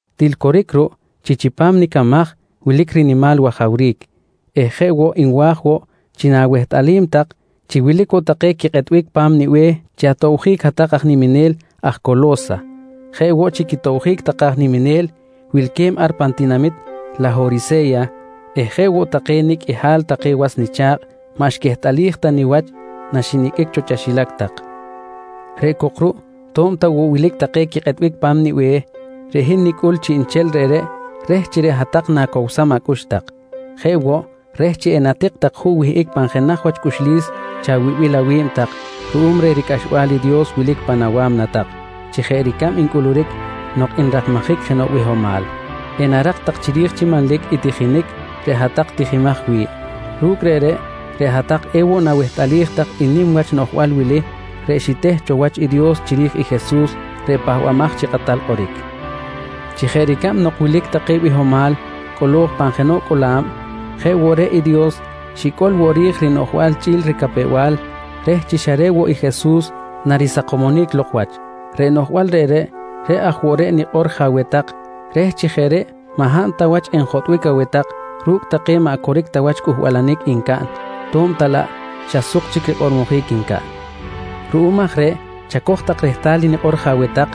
Til coric ruꞌ chi chipam nicamaj wilic rinimal wajawric eh jeꞌ woꞌ nwa̱j woꞌ chi na̱wehtꞌalim tak chi wilic woꞌ take quikꞌetbic pa̱m nibe̱h chi atobjic hat-tak aj niminel aj Colo̱sa jeꞌ woꞌ chi quitobjic take aj niminel wilque̱b ar pan tinamit Lahorise̱ya eh jeꞌ woꞌ take nicꞌ qꞌuihal take was nicha̱kꞌ maꞌ xquehtꞌalij ta niwach naxiniqꞌuic cho chaxilac tak. Reꞌ cok ruꞌ to̱b ta woꞌ wilic take quikꞌetbic pa̱m nibe̱h, reꞌ hin nicuy chiꞌnchel reꞌreꞌ reh chi reꞌ hat-tak na̱cowsam acꞌux tak. Jeꞌ woꞌ, reh chi enatik tak juꞌ wihꞌic pan jenaj wach cꞌuxlis chawibil awi̱b tak ruꞌum reh ricꞌaxbal i Dios wilic pan awa̱mna tak chi jeꞌ ricab ncꞌuluric nok nrakmajic jenoꞌ bihomal, enarak tak chiri̱j chi manlic i tijinic reꞌ hat-tak tijimaj wi̱ꞌ. Ru̱cꞌ reꞌreꞌ, reꞌ hat-tak ewoꞌ nawehtꞌalij tak i nim wach noꞌjbal wili reꞌ xiteh cho wach i Dios chiri̱j i Jesus reꞌ Pahbamaj chi Kꞌatal Kꞌoric: Chi jeꞌ ricab nok wilic take bihomal cꞌolo̱j pan jenoꞌ cꞌola̱b, jeꞌ woꞌ reꞌ i Dios xicꞌol woꞌ ri̱j rinoꞌjbal chꞌi̱l ricapew-bal reh chi xa reꞌ woꞌ i Jesus narisakomonic lok wach. Reꞌ noꞌjbal reꞌreꞌ, reꞌ aj woꞌ reꞌ nikꞌor je aweh tak reh chi jeꞌ reꞌ maꞌ hab ta wach enjotꞌbic aweh tak ru̱cꞌ take maꞌ coric ta wach cꞌuhbalanic ncaꞌn to̱b ta laꞌ xa suk chic rikꞌormojic ncaꞌn. Ruꞌum aj reꞌ chacoj tak rehtal i nikꞌor je aweh tak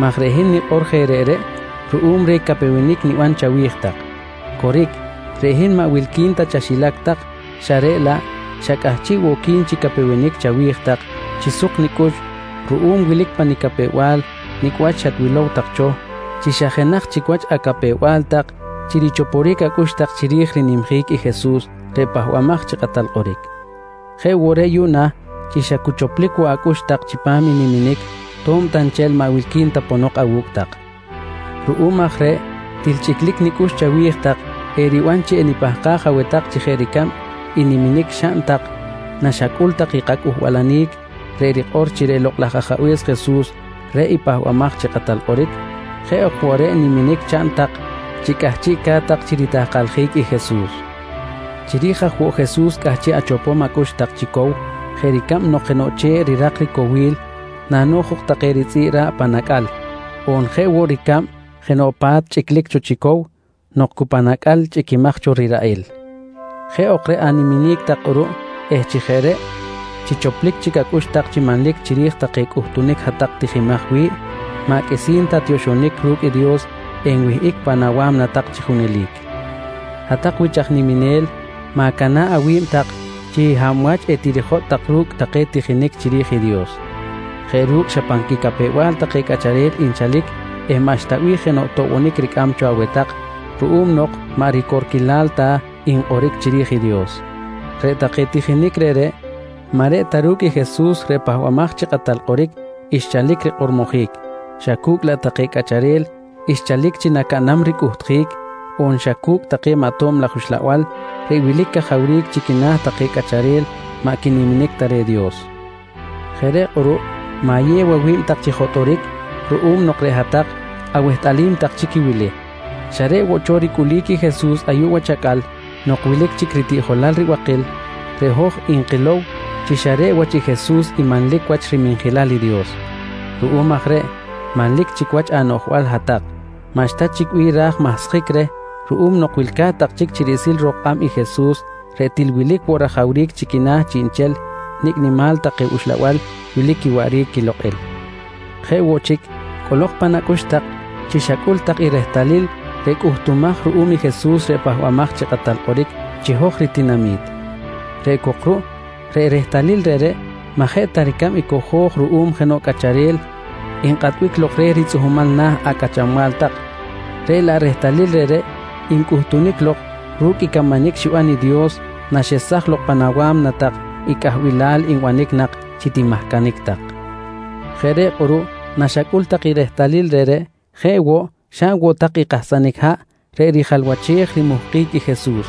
maj reꞌ hin nikꞌor je reꞌreꞌ ruꞌum reh capewenic niban chawi̱j tak. Coric, reꞌ hin maꞌ wilqui̱n ta chaxilac tak xa reꞌ laꞌ xa cꞌahchiꞌ woꞌ qui̱n chi capewenic chawi̱j tak chi suk nicꞌux ruꞌum wilic pa nicapew-bal nicꞌ wach naxatwilow tak cho chi xa jenaj chic wach acapew-bal tak chi richoporic acꞌux tak chiri̱j rinimjic i Jesus reꞌ Pahbamaj chi Kꞌatal Kꞌoric. Jeꞌ woꞌ reꞌ yuꞌna chi xa cu choplic woꞌ acꞌux tak chipam i niminic to̱b ta nchel maꞌ wilqui̱n ta ponok awu̱cꞌ tak. Ruꞌum aj reꞌ til chꞌiclic nicꞌux chawi̱j tak, eriban chi enipahkaj aweh tak chi jeꞌ ricab i niminic xaꞌn tak naxacꞌul tak i kacꞌuhbalanic reꞌ rikꞌor chi reꞌ Lokꞌ laj Ajabe̱s Jesus reꞌ i Pahbamaj chi Kꞌatal Kꞌoric, jeꞌ ok woꞌ reꞌ niminic chaꞌn tak chi cꞌahchiꞌca̱t tak chi ritahkaljic i Jesus. Chiri̱j aj woꞌ Jesus cꞌahchiꞌ achopom acꞌux tak chi cow jeꞌ ricab nok jenoꞌ che̱ꞌ rirak ricowil nano̱j jok take ritzꞌi̱ꞌ ra̱ꞌ pan acꞌal, on jeꞌ woꞌ ricab jenoꞌ pa̱t chꞌiclic chi cow nok cu pan acꞌal chꞌiquimaj cho riraꞌil. Jeꞌ ok reꞌ animinic tak kꞌuruꞌ eh chi jeꞌ reꞌ chi choplic chic acꞌux tak chi manlic chiri̱j take cꞌuhtunic hat-tak tijimaj wi̱ꞌ, maꞌ qꞌuisi̱n ta tioxonic ru̱cꞌ Dios enwihꞌic pan awa̱mna tak chi junelic. Hat-tak wich aj niminel, ma̱cana̱ꞌ awi̱b tak chi hab wach etirijotꞌ tak ru̱cꞌ take tijinic chiri̱j i Dios jeꞌ ru̱cꞌ xa pan quicapew-bal take cꞌacharel nchalic eh maꞌxta bih jenoꞌ toꞌbonic ricꞌam cho aweh tak ruꞌum nok maꞌ ricorquilal ta nkꞌoric chiri̱j i Dios. Reꞌ take tijinic reꞌreꞌ maꞌ reꞌ ta ru̱cꞌ i Jesus reꞌ Pahbamaj chi Kꞌatal Kꞌoric xchalic rikꞌormojic xa cu̱cꞌ laꞌ take cꞌacharel xchalic chi nacaꞌnam ricꞌuhtjic on xa cu̱cꞌ take maꞌ tob laj uxlabal reꞌ wilic cajawric chi quina̱ take cꞌacharel maꞌ quiniminic ta reh i Dios. Jeꞌ reꞌ kꞌuruꞌ ma̱yew awi̱b tak chi jotꞌoric ruꞌum nok reꞌ hat-tak awehtꞌalim tak chic i wili: Xa reꞌ woꞌ cho ricꞌulic i Jesus ayuꞌ wach acꞌal nok wilic chic ritiꞌjolal ribakil, reꞌ hoj nkilow chi xa reꞌ wach i Jesus i manlic wach riminjilal Dios. Ruꞌum aj reꞌ manlic chic wach anoꞌjbal hat-tak, maꞌxta chic bih ra̱j mahsjic reh ruꞌum nok wilca̱t tak chic chi riꞌsil ro̱k kꞌab i Jesus reꞌ til wilic woꞌ rajawric chi quina̱ chiꞌnchel nicꞌ nimal take uxlabal wilic quiwaꞌric quilokꞌil. Jeꞌ woꞌ chic, cꞌolok pan acꞌux tak chi xacꞌul tak i rehtalil reꞌ cꞌuhtumaj ruꞌum i Jesus reꞌ Pahbamaj chi Kꞌatal Kꞌoric chi hoj ritinami̱t. Reꞌ cok ruꞌ reꞌ rehtalil reꞌreꞌ maꞌ jeꞌ ta ricab i cojo̱j ruꞌum jenoꞌ cꞌacharel nkꞌatbic lok reh ritzꞌuhmal na̱ acꞌachanbal tak, reꞌ laꞌ rehtalil reꞌreꞌ ncꞌuhtunic lok ru̱cꞌ i camanic xiban i Dios naxesaj lok pan awa̱mna tak i cꞌahbilal nbanic nak chi timahcanic tak. Jeꞌ reꞌ kꞌuruꞌ naxacꞌul tak i rehtalil reꞌreꞌ jeꞌ woꞌ xaꞌn woꞌ tak i kahsanic haꞌ reꞌ rijalwachej rimuhkic i Jesus.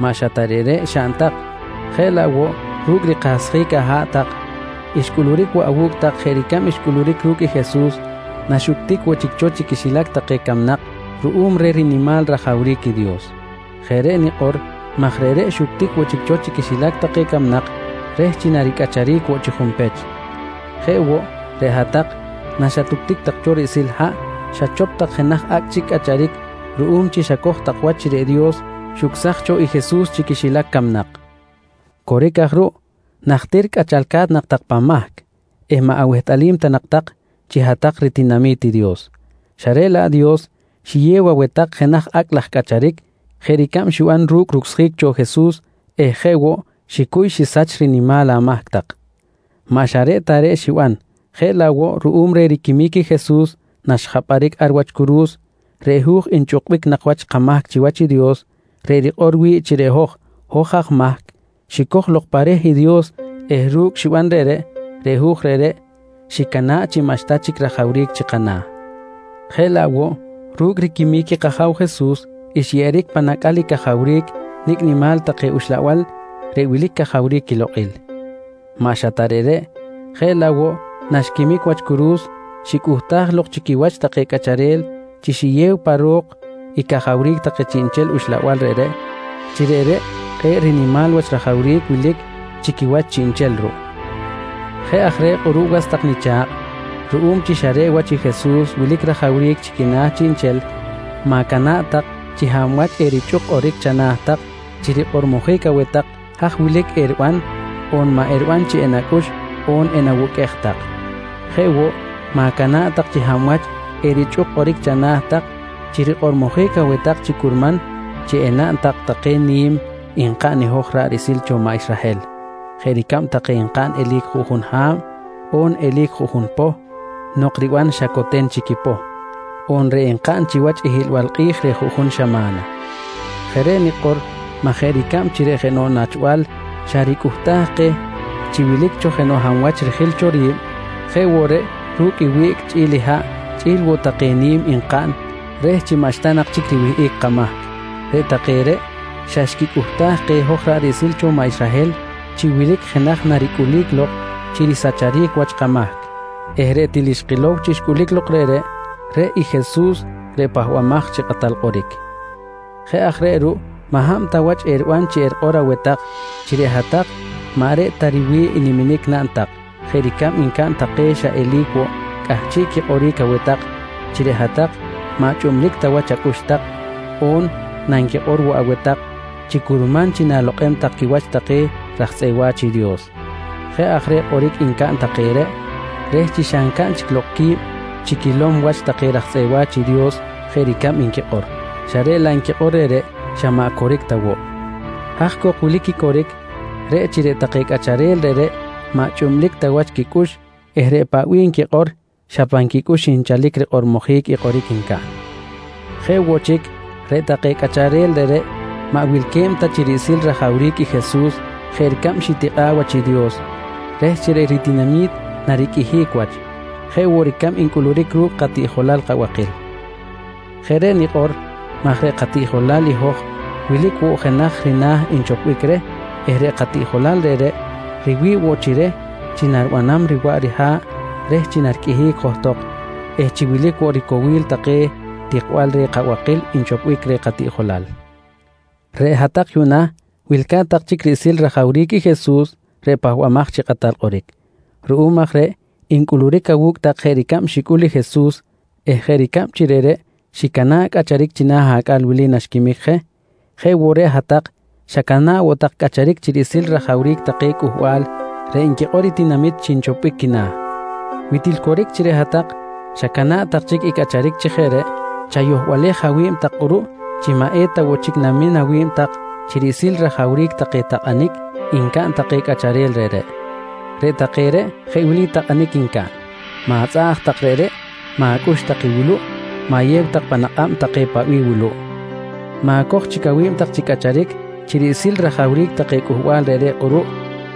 Maꞌ xa ta reꞌreꞌ xaꞌn tak jeꞌ laꞌ woꞌ ru̱cꞌ rikahsjic aha̱ꞌ tak xcꞌuluric woꞌ awu̱cꞌ tak jeꞌ ricab xcꞌuluric ru̱cꞌ i Jesus naxuctic woꞌ chic cho chi quixilac take camnak ruꞌum reh rinimal rajawric i Dios. Jeꞌ reꞌ nikꞌor maj reꞌreꞌ xuctic woꞌ chic cho chi quixilac take camnak reh chi naricꞌacharic woꞌ chi junpech. Jeꞌ woꞌ, reꞌ hat-tak naxatuctic tak cho riꞌsil haꞌ xachop tak jenaj acꞌ chic cꞌacharic ruꞌum chi xacoj tak wach chi reꞌ Dios xucsaj cho i Jesus chi quixilac camnak. Coric aj ruꞌ, najtir cꞌachalca̱t nak tak pan mahc eh maꞌ awehtꞌalim ta nak tak chi hat-tak ritinami̱t i Dios, xa reꞌ laꞌ Dios xiyew aweh tak jenaj acꞌ laj cꞌacharic jeꞌ ricab xiban ru̱cꞌ rucsjic cho Jesus eh jeꞌ woꞌ xicuy xisach rinimal amahc tak. Maꞌ xa reꞌ ta reꞌ xiban jeꞌ laꞌ woꞌ ruꞌum reh riquimic i Jesus naxjapꞌaric ar wach curu̱s, reꞌ hu̱j nchꞌukbic nak wach kamahc chiwach i Dios reꞌ rikꞌor wi̱ꞌ chi reꞌ hoj, hoj aj mahc xicoj lok pa reh i Dios eh ru̱cꞌ xiban reꞌreꞌ, reꞌ hu̱j reꞌreꞌ xicana̱ꞌ chi maꞌxta chic rajawric chi kana̱. Jeꞌ laꞌ woꞌ ru̱cꞌ riquimic i kAja̱w Jesus, xyeꞌeric pan acꞌal i cajawric nicꞌ nimal take uxlabal reꞌ wilic cajawric quilokꞌil. Maꞌ xa ta reꞌreꞌ jeꞌ laꞌ woꞌ naxquimic wach curu̱s xicꞌuhtaj lok chi quiwach take cꞌacharel chi xiyew pa ro̱k i cajawric take chiꞌnchel uxlabal reꞌreꞌ chi reꞌreꞌ kꞌe̱ꞌ nimal wach rajawric wilic chi quiwach chiꞌnchel ruꞌ. Jeꞌ aj reꞌ kꞌuruꞌ was tak nicha̱kꞌ, ruꞌum chi xa reꞌ wach i Jesus wilic rajawric chi quina̱ chiꞌnchel, ma̱cana̱ꞌ tak chi hab wach erichꞌuk kꞌoric chana̱ tak chi rikꞌormojic aweh tak haj wilic eriban on maꞌ eriban chi enacꞌux on enawuqꞌuej tak. Jeꞌ woꞌ, ma̱cana̱ꞌ tak chi hab wach erichꞌuk kꞌoric chana̱ tak chi rikꞌormojic aweh tak chi curman chi enaꞌn tak take ni̱m nkaꞌn hoj ra̱ꞌ riꞌsil cho maꞌ Israhel jeꞌ ricab take nkaꞌn eli̱c juꞌjun ha̱b, on eli̱c juꞌjun poh nok riban xa coten chic i poh, on reꞌ nkaꞌn chiwach i hiꞌlbal kꞌi̱j reh juꞌjun xama̱na. Jeꞌ reꞌ nikꞌor maj jeꞌ ricab chi reꞌ jenoꞌ nachbal xa ricꞌuhtaj keh chi wilic jenoꞌ hab wach rijil cho ri̱b, jeꞌ woꞌ reꞌ ru̱cꞌ i wiꞌc chꞌi̱l i haꞌ chꞌi̱l woꞌ take ni̱m nkaꞌn reh chi maꞌxta nak chic riwihꞌic kamahc, reꞌ take reꞌ xa xquicꞌuhtaj keh hoj ra̱ꞌ riꞌsil cho maꞌ Israhel chi wilic jenaj naricꞌulic lok chi risacharic wach kamahc eh reꞌ til xkilow chi xcꞌulic lok reꞌreꞌ, reꞌ i Jesus reꞌ Pahbamaj chi Kꞌatal Kꞌoric. Jeꞌ aj reꞌ ruꞌ maꞌ hab ta wach eriban chi erikꞌor aweh tak chi reꞌ hat-tak maꞌ reꞌ ta riwi̱ꞌ niminic naꞌn tak jeꞌ ricab ncaꞌn take xa eli̱c woꞌ cꞌahchiꞌ quikꞌoric aweh tak chi reꞌ hat-tak maꞌ chꞌublic ta wach acꞌux tak, on nanquikꞌor woꞌ aweh tak chi curman chi na̱lokꞌem tak quiwach take raj tzꞌeꞌ wa̱ch i Dios. Jeꞌ aj reꞌ kꞌoric ncaꞌn take reꞌ reh chi xa ncaꞌn chic lok qui̱b chi quilom wach take raj tzꞌeꞌ wa̱ch i Dios jeꞌ ricab nquikꞌor, xa reꞌ laꞌ nquikꞌor reꞌreꞌ, xa maꞌ coric ta woꞌ. Haj cok wilic i coric, reꞌ chi reꞌ take cꞌacharel reꞌreꞌ maꞌ chꞌublic ta wach quicꞌux eh reꞌ paꞌ bih nquikꞌor xa pan quicꞌux nchalic rikꞌormojic i kꞌoric ncaꞌn. Jeꞌ woꞌ chic, reꞌ take cꞌacharel reꞌreꞌ, maꞌ wilque̱b ta chi riꞌsil i rajawric i Jesus jeꞌ ricab xitikꞌa̱ꞌ wach i Dios reh chi reꞌ ritinami̱t nariqꞌuihic wach, jeꞌ woꞌ ricab ncꞌuluric ru̱cꞌ katiꞌjolal kabakil. Jeꞌ reꞌ nikꞌor maj reꞌ katiꞌjolal i hoj wilic woꞌ jenaj rina̱ nchopbic reh eh reꞌ katiꞌjolal reꞌreꞌ riwi̱ꞌ woꞌ chi reh chi naribanam riwaꞌ riha̱ꞌ reh chi nariqꞌuihic johtok eh chi wilic woꞌ ricowil take tikbal reh kabakil nchopbic reh katiꞌjolal. Reꞌ hat-tak yuꞌna wilca̱t tak chic riꞌsil rajawric i Jesus reꞌ Pahbamaj chi Kꞌatal Kꞌoric. Ruꞌum aj reꞌ ncꞌuluric awu̱cꞌ tak jeꞌ ricab xicꞌul i Jesus eh jeꞌ ricab chi reꞌreꞌ xicana̱ꞌ cꞌacharic china̱ acꞌal wili naxquimic je, jeꞌ woꞌ reꞌ hat-tak xacana̱ꞌ woꞌ tak cꞌacharic chi riꞌsil rajawric take cꞌuhbal reꞌ nquikꞌor i tinamit chi nchoponic quina̱. Wi til coric chi reꞌ hat-tak xacana̱ꞌ tak chic i cꞌacharic chi jeꞌ reꞌ, chayohbalej awi̱b tak kꞌuruꞌ chi maꞌ eta woꞌ chic namin awi̱b tak chi riꞌsil rajawric take takꞌanic ncaꞌn take cꞌacharel reꞌreꞌ. Reꞌ take reꞌ jeꞌ wili takꞌanic ncaꞌn: Ma̱tzꞌaꞌj tak reꞌreꞌ, ma̱cꞌux tak i wuluꞌ, ma̱yew tak pan akꞌab tak take paꞌ bih wuluꞌ. Ma̱coj chic awi̱b tak chi cꞌacharic chi riꞌsil rajawric take cꞌuhbal reꞌreꞌ kꞌuruꞌ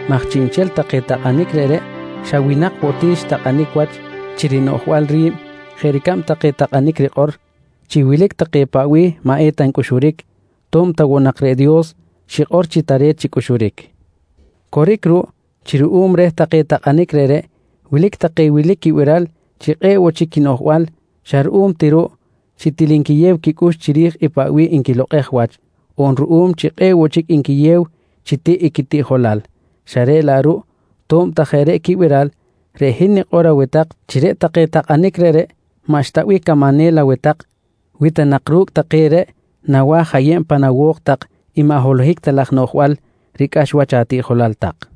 maj chiꞌnchel take takꞌanic reꞌreꞌ xa winak woꞌ ti xtakꞌanic wach chi rinoꞌjbal ri̱b jeꞌ ricab take takꞌanic rikꞌor chi wilic take paꞌ bih maꞌ eta ncꞌuxuric to̱b ta woꞌ nak reꞌ Dios xikꞌor chi tare̱t chi cꞌuxuric. Coric ruꞌ chi ruꞌum reh take takꞌanic reꞌreꞌ, wilic take wilic quibiral chi kꞌe̱ꞌ woꞌ chic quinoꞌjbal xa ruꞌum ti ruꞌ chi til nquiyew quicꞌux chiri̱j i paꞌ bih nquilokꞌej wach on ruꞌum chi kꞌe̱ꞌ woꞌ chic nquiyew chi tiꞌ i quitiꞌjolal, xa reꞌ laꞌ ruꞌ to̱b ta jeꞌ reꞌ quibiral, reꞌ hin nikꞌor aweh tak chi reꞌ take takꞌanic reꞌreꞌ maꞌxta bih camanel aweh tak wi ta nak ru̱cꞌ take reꞌ nawa̱j ayeb pan awo̱k tak i maꞌ holohic ta laj noꞌjbal ricꞌax wach atiꞌjolal tak.